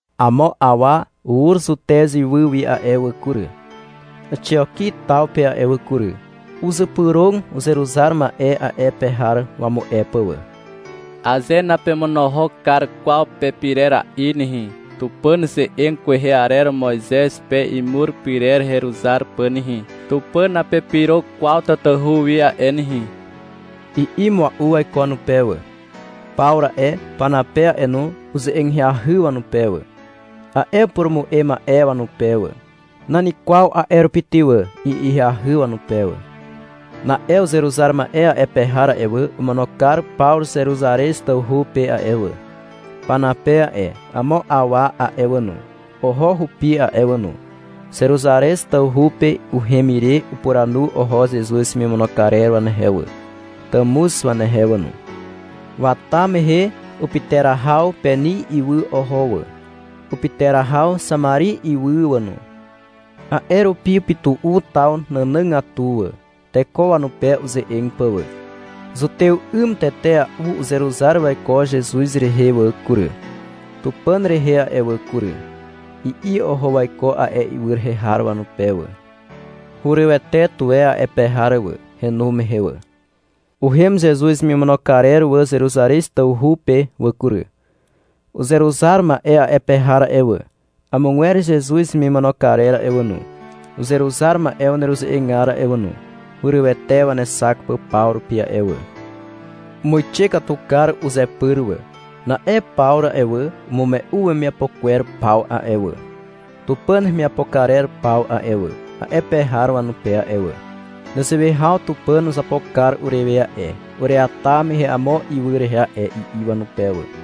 Amo awa ur Zutez ywy wi a'e wà kury, Àxioki taw pe a'e wà kury. Uzypyrog uzeruzar ma'e a'e pe har wamu'e pà wà. — Aze napemonohok kar kwaw pepirera'i nehe, Tupàn ze'eg kwehe arer Moizez pe imur pyrer heruzar pà nehe, Tupàn napepyro kwaw tatahu wi a'e nehe, i'i mua'u waiko wanupe wà. Pawru a'e, Panape a'e no, uze'eg ahyahy wanupe wà, a'e upurumu'e ma'e wanupe wà. — Nan kwaw a'e rupi ty wà, i'i ahyahy wanupe wà. Na'e uzeruzar ma'e a'e pe har a'e wà, omono kar Pawru Zeruzarez tawhu pe a'e wà. Panape a'e, amo awa a'e wà no, oho hupi a'e wà no. Zeruzarez tawhu pe uhem ire upuranu oho Zezuz hemimono karer wanehe wà, tàmuz wanehe wà no. Wata mehe upyterahaw Peni ywy oho wà, upyterahaw Xamari ywy wà no. A'e rupi upytu'u taw nànàgatu wà, teko wanupe uze'eg pà wà. — Zutew 'ym tetea'u uzeruzar waiko Zezuz rehe a'e wà kury, Tupàn rehe a'e wà kury, i'i oho waiko a'e ywy rehe har wanupe wà. Hurywete tuwe a'e pe har wà, henu mehe wà. Uhem Zezuz hemimono karer wà Zeruzarez tawhu pe wà kury. Uzeruzar ma'e a'e pe har a'e wà, amogwer Zezuz hemimono karer a'e wà no, uzeruzar ma'e waneruze'egar a'e wà no, hurywete wanexak pà paw rupi a'e wà. Umuixe katu kar uzepyr wà. Na'e Pawru a'e wà, umume'u wemiapo kwer paw a'e wà, Tupàn hemiapo karer paw a'e wà, a'e pe har wanupe a'e wà. — Nezewe haw Tupàn uzapo kar urewe a'e, ureata mehe amo ywy rehe a'e, i'i wanupe wà.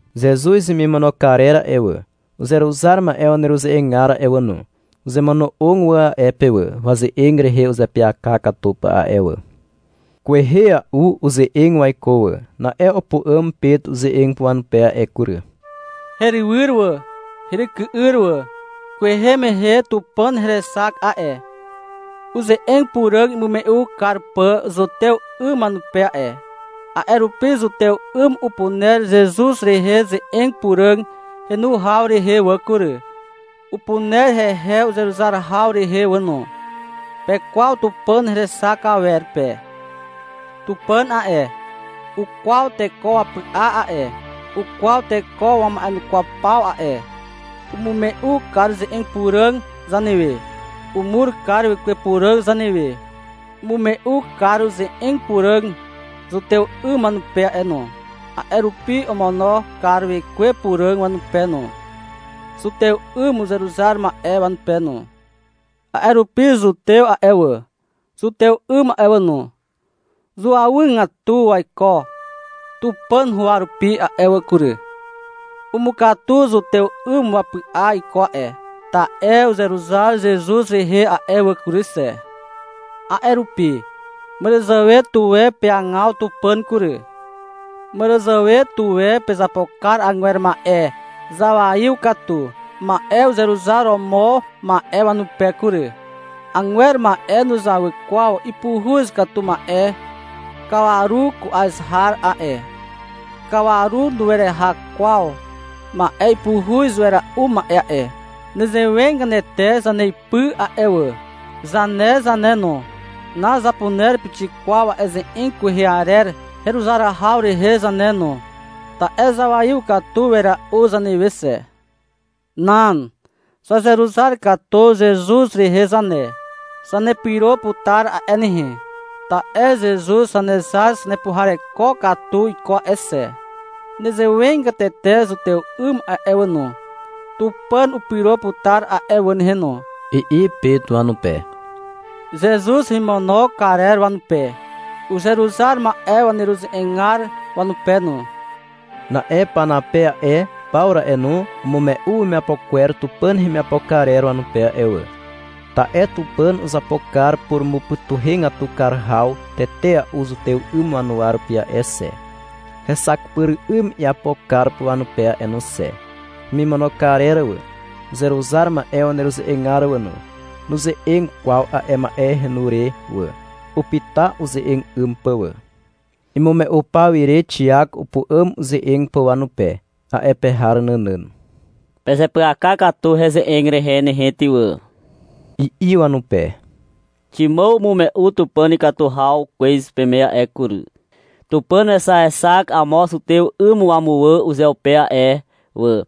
Zezuz hemimono karer a'e wà, uzeruzar ma'e waneruze'egar a'e wà no, uzemono'og wà a'e pe a'e wà, waze'eg rehe uzeapyaka katu pà a'e wà. Kwehea'u uze'eg waiko wà. Na'e upu'àm Pet uze'eg pà wanupe a'e kury. -Herywyr wà, heryky'yr wà. Kwehe mehe Tupàn herexak a'e, uze'eg puràg imume'u kar pà zutew 'ym wanupe a'e. A'e rupi zutew 'ym upuner Zezuz rehe ze'eg puràg henu haw rehe wà kury, upuner hehe uzeruzar haw rehe wà no. Pekwaw Tupàn herexak awer pe. Tupàn a'e, ukwaw teko wapy'a a'e, ukwaw teko wama'enukwaw paw a'e. Umume'u kar ze'eg puràg zanewe. Umur kar Wekwe Puràg zanewe. Umume'u kar uze'eg puràg zutew 'ym wanupe a'e no. A'e rupi omono kar Wekwe Puràg wanupe no, zutew 'ym uzeruzar ma'e wanupe no. — A'e rupi zutew a'e wà, zutew 'ym a'e wà no, zuawygatu waiko Tupàn huwa rupi a'e wà kury. Umukatu zutew 'ym wapy'a iko a'e, ta'e uzeruzar Zezuz rehe a'e wà kury xe. A'e rupi, màràzàwe tuwe peagaw Tupàn kury. Màràzàwe tuwe pezapo kar agwer ma'e zawaiw katu ma'e uzeruzar romo ma'e wanupe kury. Agwer ma'e nuzawy kwaw ipuhuz katu ma'e kawaru ku'az har a'e. Kawaru nueraha kwaw ma'e ipuhuz wera'u ma'e a'e. Nezewegatete zaneipy a'e wà, zane zane no, nazapuner pixik kwaw a'e ze'eg kwehe arer heruzar haw rehe zane no, ta'e zawaiw katu wera'u zanewe xe. Nan. Zazeruzar katu Zezuz rehe zane. Zanepyro putar a'e nehe, ta'e Zezuz Zanezar zanepuhareko katu iko a'e xe. Nezewegatete zutew 'ym a'e wà no. Tupàn upyro putar a'e wà nehe no, i'i Pet wanupe, Zezuz hemimono karer wanupe, uzeruzar ma'e waneruze'egar wanupe no. Na'e Panape a'e, Pawru a'e no, umume'u wemiapo kwer Tupàn hemiapo karer wanupe a'e wà. Ta'e Tupàn uzapo kar purumupytuhegatu kar haw tetea'u zutew 'ym wanuwa rupi a'e xe, hexak pyr 'ym iapo kar pà wanupe a'e no xe. Hemimono karer wà, uzeruzar ma'e waneruze'egar wà no, nuze'eg kwaw a'e ma'e henu re wà. Upyta uze'eg 'ym pà wà. Imume'u pawire Xiak upu'àm uze'eg pà wanupe, a'e pe har nànàn. -Pezeapyaka katu heze'eg rehe nehe ty wà, i'i wanupe. — Ximàw umume'u Tupàn ikatu haw kwez peme a'e kury. Tupàn wexaexak amo zutew 'ym wamuwà uzeupe a'e wà,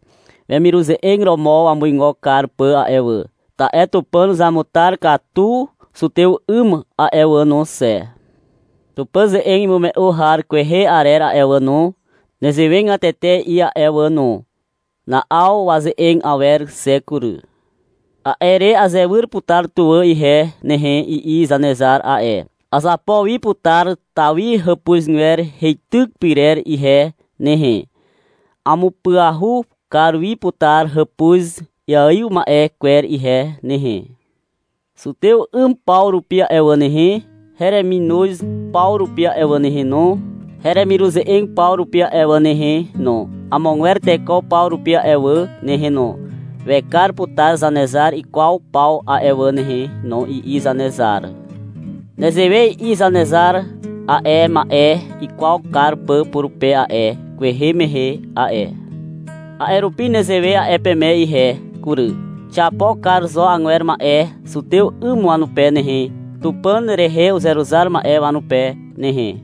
wemiruze'eg romo wamuigo kar pà a'e wà. Ta'e Tupàn uzamutar katu zutew 'ym a'e wà no xe. Tupàn ze'eg imume'u har kwehe arer a'e wà no, nezewegatete i'i a'e wà no. Na'aw waze'eg awer xe kury. — A'e re azewyr putar tuwà ihe nehe, i'i Zanezar a'e. — Azapo wi putar Tawi hàpuzgwer heityk pyrer ihe nehe. Amupyahu kar wi putar hàpuz iaiw ma'e kwer ihe nehe. Zutew 'ym paw rupi a'e wà nehe, hereminoz paw rupi a'e wà nehe no, heremiruze'eg paw rupi a'e wà nehe no, amogwer teko paw rupi a'e wà nehe no, wekar putar Zanezar ikwaw paw a'e wà nehe no, i'i Zanezar. Nezewe i'i Zanezar, a'e ma'e ikwaw kar pà purupe a'e, kwehe mehe a'e. A'e rupi nezewe a'e peme ihe kury. Xiapo kar zo agwer ma'e zutew 'ym wanupe nehe, Tupàn rehe uzeruzar ma'e wanupe nehe.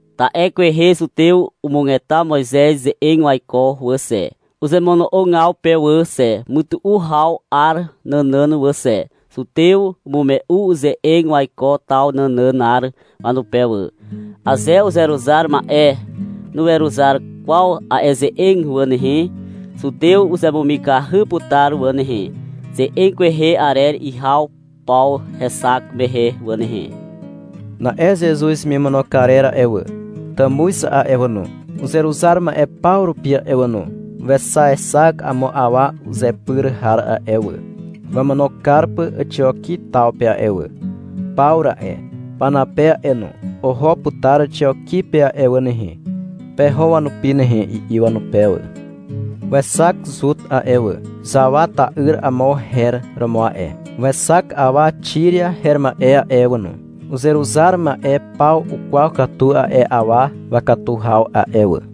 Ta'e kwehe zutew umugeta Moizez ze'eg waiko wà xe, uzemono'ogaw pe wà xe, mytu'u haw 'ar nànàn wà xe. Zutew umume'u ize'eg waiko taw nànànar wanupe wà. (Aze uzeruzar ma'e nuweruzar kwaw a'e ze'eg wà nehe, zutew uzemumikahy putar wà nehe, ze'eg kwehe arer ihaw paw hexak mehe wà nehe.) Na'e Zezuz hemimono karer a'e wà, tàmuz a'e wà no, uzeruzar ma'e paw rupi a'e wà no, wexaexak amo awa uzepyr har a'e wà, wamono kar pà Àxioki taw pe a'e wà. — Pawru a'e, Panape a'e no, oho putar Àxioki pe a'e wà nehe. Peho wanupi nehe, i'i wanupe wà. Wexak Zut a'e wà. Xawa ta'yr amo her romo a'e. Wexak awa Xiria her ma'e a'e wà no. Uzeruzar ma'e paw ukwaw katu a'e awa wakatu haw a'e wà.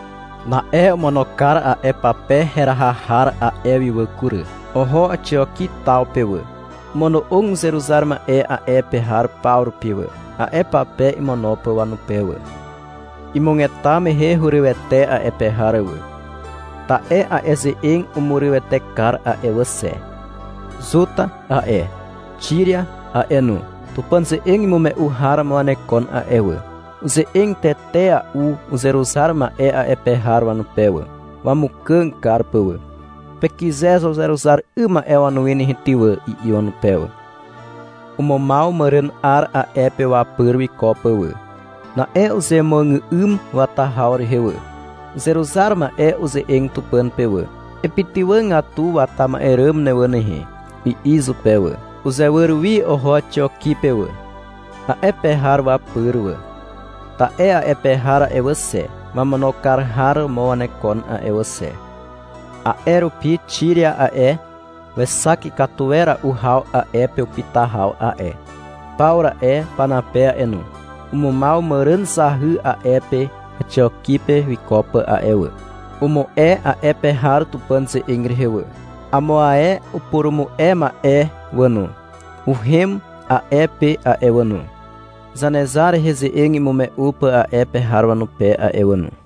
Na'e omono kar a'e pape heraha har a'e wi wà kury. Oho Àxioki taw pe wà. Omono'og uzeruzar ma'e a'e pe har paw rupi wà, a'e pape imono pà wanupe wà. Imugeta mehe hurywete a'e pe har wà. Ta'e a'e ze'eg umurywete kar a'e wà xe. Zut a'e, Xiria a'e no, Tupàn ze'eg imume'u har romo wanekon a'e wà. Uze'eg tetea'u uzeruzar ma'e a'e pe har wanupe wà, wamukàg kar pà wà. — Pekyze zo uzeruzar 'ym ma'e wanuwi nehe ty wà, i'i wanupe wà. Umumaw màràn 'ar a'e pe wapyr wiko pà wà. Na'e uzemuàgà'ym wata haw rehe wà. Uzeruzar ma'e uze'eg Tupàn pe wà. — Epytywàgatu wata ma'e ràm ne wà nehe, i'i izupe wà. Uzewyr wi oho Àxioki pe wà, a'e pe har wapyr wà. Ta'e a'e pe har a'e wà xe, wamono kar har romo wanekon a'e wà xe. A'e rupi Xiria a'e, wexak ikatu wera'u haw a'e pe upyta haw a'e. Pawru a'e, Panape a'e no, umumaw màràn zahy a'e pe Àxioki pe wiko pà a'e wà. Umu'e a'e pe har Tupàn ze'eg rehe wà. Amo ae upurumu'e ma'e wà no, uhem a'e pe a'e wà no, Zanezar rehe ze'eg imume'u pà a'e pe har wanupe a'e wà no.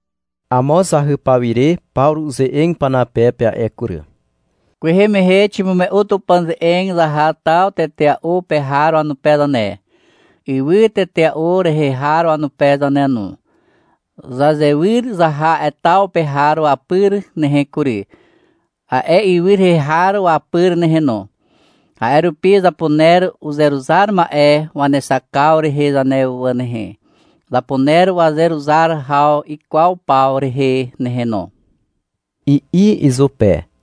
Amo zahy pawire Pawru uze'eg Panape pe a'e kury. -Kwehe mehe ximume'u Tupàn ze'eg zaha taw tetea'u pe har wanupe zane, ywy tetea'u rehe har wanupe zane no. Zazewyr zaha a'e taw pe har wapyr nehe kury, a'e ywy rehe har wapyr nehe no. A'e rupi zapuner uzeruzar ma'e wanexakaw rehe zane wà nehe, zapuner wazeruzar haw ikwaw paw rehe nehe no, i'i izupe.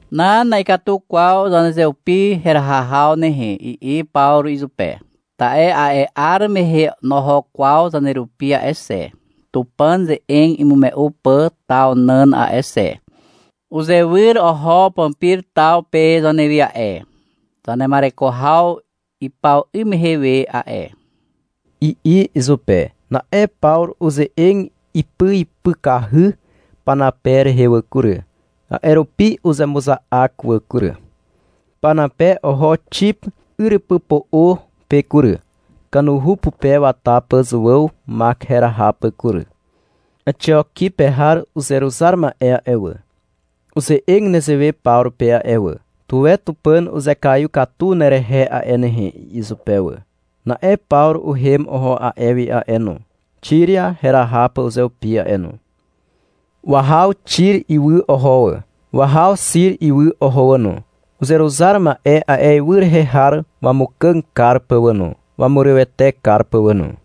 — Nan, na'ikatu kwaw zanezeupi heraha haw nehe, i'i Pawru izupe. — Ta'e a'e 'ar mehe noho kwaw zanerupi a'e xe, Tupàn ze'eg imume'u pà taw nàn a'e xe. Uzewyr oho Pampir taw pe zanewi a'e, zanema'ereko haw ipaw 'ym mehe we a'e, i'i izupe. Na'e Pawru uze'eg ipyipykahy Panape rehe wà kury. A'e rupi uzemuza'ak wà kury. Panape oho Xip yrypypo'o pe kury, kanuhu pupe wata pà Zuàw Mak heraha pà kury. Àxioki pe har uzeruzar ma'e a'e wà, uze'eg nezewe Pawru pe a'e wà. — Tuwe Tupàn uzekaiw katu nerehe a'e nehe, i'i izupe wà. Na'e Pawru uhem oho a'e wi a'e no, Xiria heraha pà uzeupi a'e no. Wahaw Xir ywy oho wà. Wahaw Xiri ywy oho wà no, uzeruzar ma'e a'e ywy rehe har wamukàg kar pà wà no, wamurywete kar pà wà no.